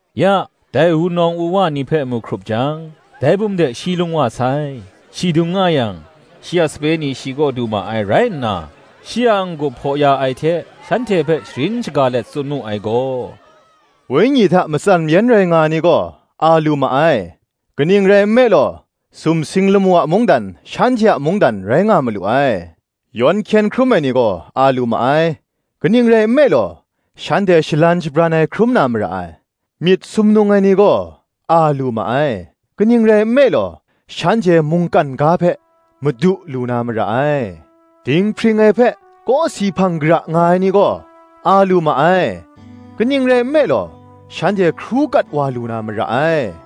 Ya, dai wunawng wuwa ni hpe mu hkrup jang, dai bum de shi lung wa sai: shi dung nga yang, shi a sape ni shi kaw du ma ai rai nna, shi a n-gup hpaw ya ai hte, shanhte hpe sharin shaga let tsun mu ai gaw: Wenyi hta matsan mayan rai nga ai ni gaw, a lu ma ai; kaning rai nme law, sumsing lamu a mungdan, shanhte a mungdan rai nga malu ai. Yawn hkyen hkrum ai ni gaw, a lu ma ai; kaning rai nme law, shanhte shalan shabran ai hkrum na mara ai. Myit sumnung ai ni gaw, a lu ma ai; kaning rai nme law, shanhte mungkan ga hpe madu lu na mara ai. Dinghpring ai hpe kawsi hpang kara nga ai ni gaw, a lu ma ai; kaning rai nme law, shanhte hkru kat wa lu na mara ai.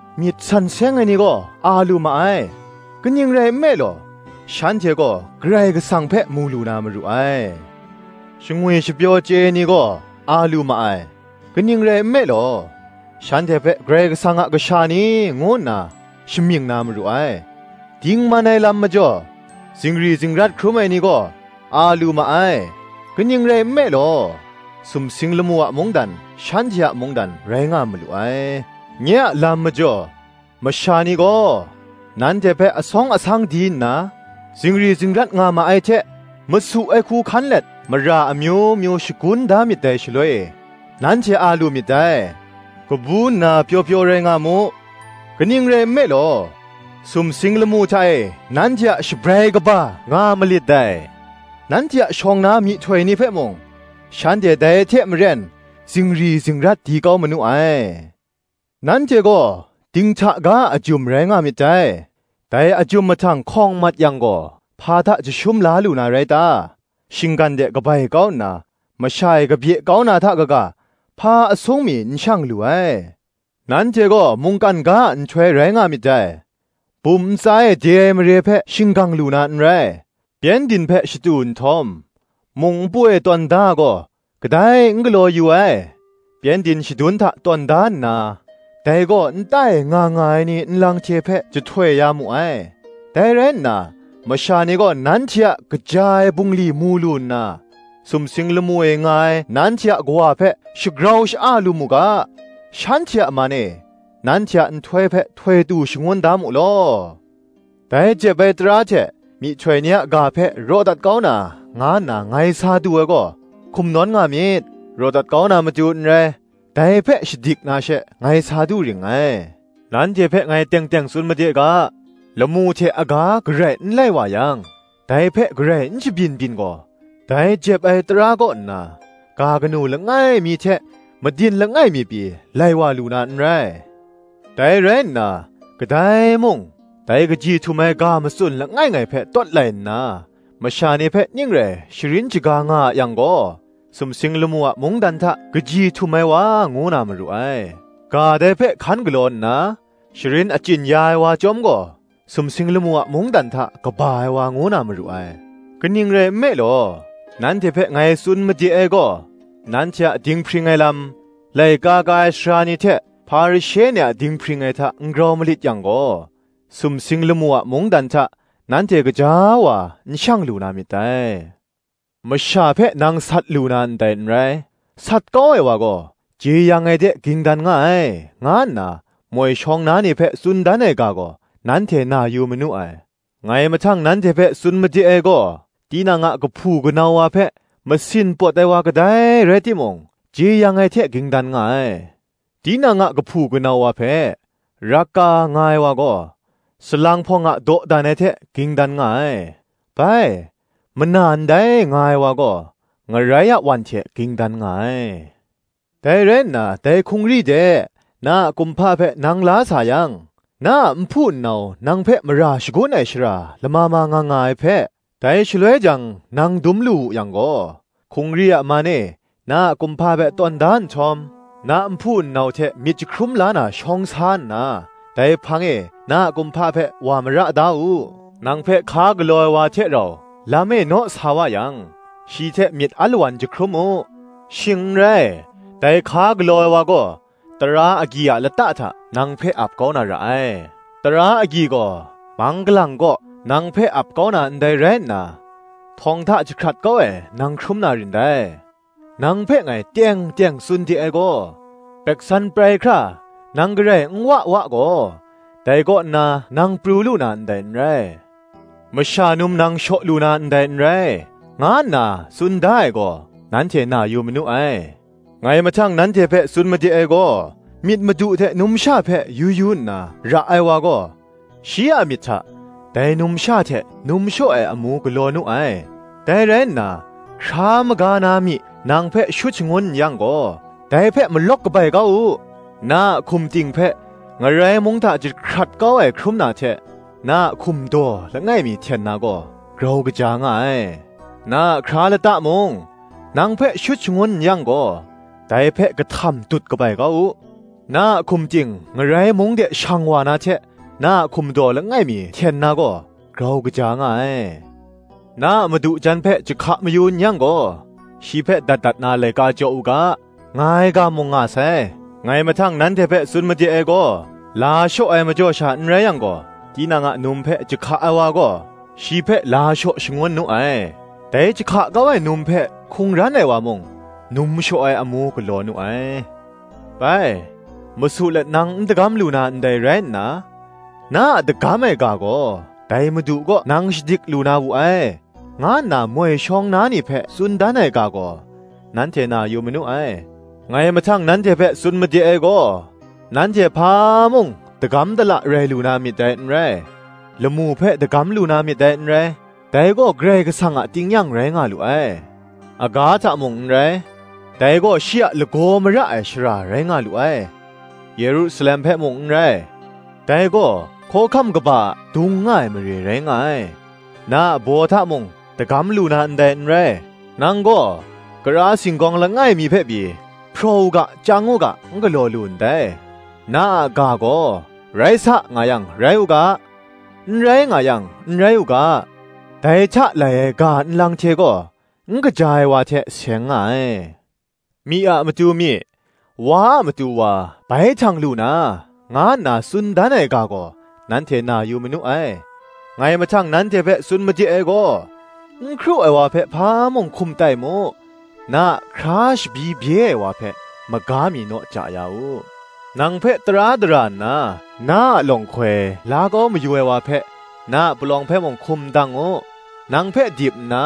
Myit san seng ai ni gaw a lu ma ai; kaning rai nme law, shanhte gaw Karai Kasang hpe mu lu na maru ai. Shangwi shapyaw chye ai ni gaw, a lu ma ai; kaning rai nme law, shanhte hpe, Karai Kasang a kasha ni, ngu nna shamying na maru ai. Dingman ai lam majaw, zingri zingrat hkrum ai ni gaw, a lu ma ai; kaning rai nme law, sumsing lamu a mungdan, shanhte a mungdan rai nga malu ai. Nye a lam majaw, masha ni gaw nanhte hpe asawng asang di nna zingri zingrat nga ma ai hte, masu ai hku hkan let mara amyu myu shagun da myit dai shaloi e, nanhte a lu myit dai: kabu nna pyaw pyaw rai nga mu; kaning rai nme law, sumsing lamu hta e nanhte a shabrai kaba nga malit dai: nanhte a shawng na myihtoi ni hpe mung shanhte dai hte maren zingri zingrat di kau manu ai. Nanhte gaw dinghta ga a ajum rai nga myit dai; dai ajum mahtang hkawng mat yang gaw, hpa hta jashum la lu na rai ta? shinggan de kabai kau nna, masha e kabye kau na hta kaga, hpa asung mi n shang lu ai. Nanhte gaw mungkan ga a nhtoi rai nga myit dai. Bum ntsa e de ai mare hpe shinggang lu na n rai; pyengdin hpe shatu nhtawm, mung npu e tawn da ai gaw, kadai n galaw yu ai; pyengdin shadun hta tawn da nna, dai gaw, nta e nga nga ai ni nlang hte hpe jahtoi ya mu ai. Dai rai nna, masha ni gaw nanhte a kaja ai bungli mu lu nna, sumsing lamu e nga ai nanhte a Kawa hpe shagrau sha-a lu mu ga, shanhte a man e nanhte a nhtoi hpe htoi tu shangun da mu law. Dai jep ai tara hte myihtoi ni a ga hpe raw dat kau na, nga nna ngai sa du ai gaw, hkum nawn nga myit; raw dat kau na matu n rai, dai hpe shadik na she, ngai sa du ring ngai. Nanhte hpe ngai teng teng tsun made ga, lamu hte aga garai n lai wa yang, dai hpe garai n shabyin byin gaw, dai jep ai tara kaw nna, ga kanu langai mi hte madin langai mi pyi, lai wa lu na n rai. Dai rai nna, kadai mung, dai kaji htum ai ga matsun langai ngai hpe tawt lai nna, masha ni hpe ning rai sharin shaga nga a yang gaw, sumsing lamu a mungdan hta kaji htum ai wa ngu na maru ai: ga dai hpe hkan galaw nna, sharin achyin ya ai wa chyawm gaw, sumsing lamu a mungdan hta, kaba ai wa ngu na maru ai. Kaning rai nme law, nanhte hpe ngai tsun made ai gaw, Nanhte a dinghpring ai lam, laika ka ai sara ni hte Hparishe ni a dinghpring ai hta n grau malit yang gaw, sumsing lamu a mungdan hta nanhte gaja wa n shang lu na myit dai. Masha hpe nang sat lu na ndai n rai; sat kau ai wa gaw, jeyang ai de ging dan nga ai, nga nna moi shawng na ni hpe tsun dan ai ga gaw, nanhte na yu manu ai. Ngai mahtang nanhte hpe tsun made ai gaw, tinang a kahpu kanau wa hpe masin pawt ai wa kadai rai timung jeyang ai hte ging dan nga ai: tinang a kahpu kanau wa hpe, Raka, nga ai wa gaw, dai salang hpawng a dawdan ai hte ging dan nga ai: bai, Mana ndai, nga ai wa gaw, ngarai a wan hte ging dan nga ai. Dai rai nna dai hkungri de, na a kumhpa hpe nang la sayang, na a nhpu nnau nang hpe mara shagun ai shara lama ma nga nga ai hpe, dai shaloi jang nang dum lu wu yang gaw, hkungri a man e na a kumhpa hpe tawn da nhtawm, na nhpu nnau hte myit jahkrum la na shawng sa nna, dai hpang e na a kumhpa hpe wa mara da u. Nang hpe hka galaw ai wa hte rau, lam e naw sa wa yang, shi hte myit alawan jahkrum u; shing n rai, dai hka galaw ai wa gaw, tara agyi a lata hta nang hpe ap kau na ra ai; tara agyi gaw mang galang kaw nang hpe ap kau na ndai rai nna, htawng hta jahkrat kau ai nang hkrum na rin dai: nang hpe ngai teng teng tsun de ai gaw, gumhpraw prai hkra nang garai n wa wa gaw, dai kaw nna nang pru lu na ndai n rai. Masha num nang shaw lu na ndai n rai, nga nna, tsun da ai gaw, nanhte na yu manu ai. Ngai mahtang nanhte hpe tsun made ai gaw, myit madu hte numsha hpe yu yu nna ra ai wa gaw, shi a myit hta, dai numsha hte, num shaw ai amu galaw nu ai. Dai rai nna, hkra maga na myi nang hpe shut shangun n yang gaw, dai hpe malawk kabai kau u; na a hkum ting hpe Ngarai mung hta jahkrat kau ai hkrum na hte, na a hkum daw langai mi hten na gaw, grau kaja nga ai. Na a hkra lata mung nang hpe shut shangun n yang gaw, dai hpe kahtam dut kabai kau u; na a hkum ting Ngarai mung de shang wa na hte, na a hkum daw langai mi hten na gaw, grau kaja nga ai. Na a madu jan hpe jahka mayu n yang gaw, shi hpe dat dat na laika jaw u ga, nga ai ga mung nga sai. Ngai mahtang nanhte hpe tsun made ai gaw, la shaw ai majaw sha n rai yang gaw, tinang a num hpe jahka ai wa gaw, shi hpe la shaw shangun nu ai; (dai jahka kau ai num hpe hkungran ai wa mung, num shaw ai amu galaw nu ai.) Bai Masu let nang n dagam lu na ndai rai nna, na a dagam ai ga gaw dai Madu kaw nang shadik lu na wu ai, nga nna moi shawng na ni hpe tsun dan ai ga gaw, nanhte na yu manu ai. Ngai mahtang nanhte hpe tsun made ai gaw, nanhte hpa mung dagam dala rai lu na myit dai n rai: lamu hpe dagam lu na myit dai n rai; dai gaw Karai Kasang a tingnyang rai nga lu ai: aga hta mung n rai; dai gaw shi a lagaw mara ai shara rai nga lu ai: Yerusalem hpe mung n rai; dai gaw hkawhkam kaba adung nga ai mare rai nga ai. Na a baw hta mung dagam lu na ndai n rai: nang gaw kara singgawng langai mi hpe pyi, hpraw u ga chyang u ga n galaw lu ndai. Na a ga gaw, Rai sa nga yang, rai u ga, N rai, nga yang, n rai u ga; dai hta lai ai ga nlang hte gaw n kaja ai wa hte seng nga ai. Myi a matu myi, wa a matu wa bai htang lu na, nga nna tsun dan ai ga gaw nanhte na yu manu ai. Ngai mahtang nanhte hpe tsun made ai gaw, N hkru ai wa hpe hpa mung hkum tai mu; na a hkra shabyi bye ai wa hpe, maga mi naw ja ya u. Nang hpe tara dara nna na a lawnghkoi la kau mayu ai wa hpe, na a palawng hpe mung hkum ndang u; nang hpe dip nna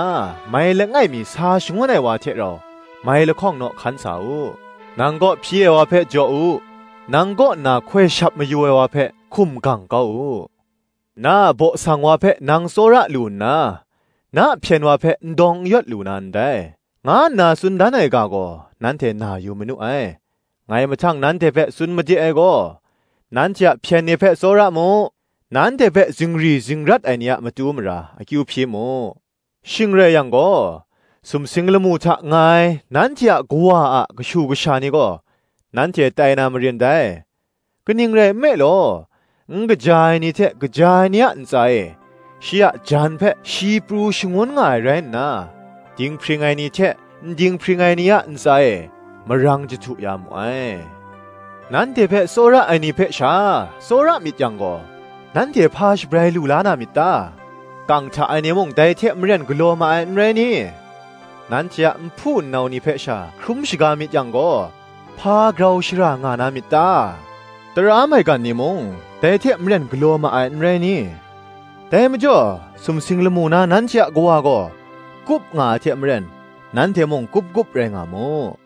mai langai mi sa shangun ai wa hte rau, mai lahkawng naw hkan sa u. Nang kaw hpyi ai wa hpe jaw u; nang kaw nna hkoi shap mayu ai wa hpe hkum gang kau u; Na a baw sang wa hpe nang tsawra lu nna, na hpyen wa hpe n dawng n yawt lu na ndai, nga nna tsun dan ai ga gaw, nanhte na yu manu ai. Ngai mahtang nanhte hpe tsun made ai gaw, nanhte a hpyen ni hpe tsawra mu: nanhte hpe zingri zingrat ai ni a matu mara akyu hpyi mu: shing rai yang gaw, sumsing lamu hta nga ai nanhte a Kawa a kashu kasha ni gaw, nanhte tai na marin dai; kaning rai nme law, n kaja ai ni hte kaja ai ni a ntsa e, shi a jan hpe shi pru shangun nga ai rai nna, dinghpring ai ni hte n ding n hpring ai ni a ntsa e, marang jahtu ya mu ai. Nanhte hpe tsawra ai ni hpe sha tsawra myit yang gaw, nanhte hpa shabrai lu la na myit ta? kang hta ai ni mung, dai hte maren galaw ma ai, n rai ni? Nanhte a nhpu nnau ni hpe sha hkrum shaga myit yang gaw, hpa grau shara nga na myit ta? tara maigan ni mung, dai hte maren galaw ma ai, n rai ni? Dai majaw, sumsing lamu na nanhte a Kawa gaw kup nga ai hte maren, nanhte mung kup kup rai nga mu.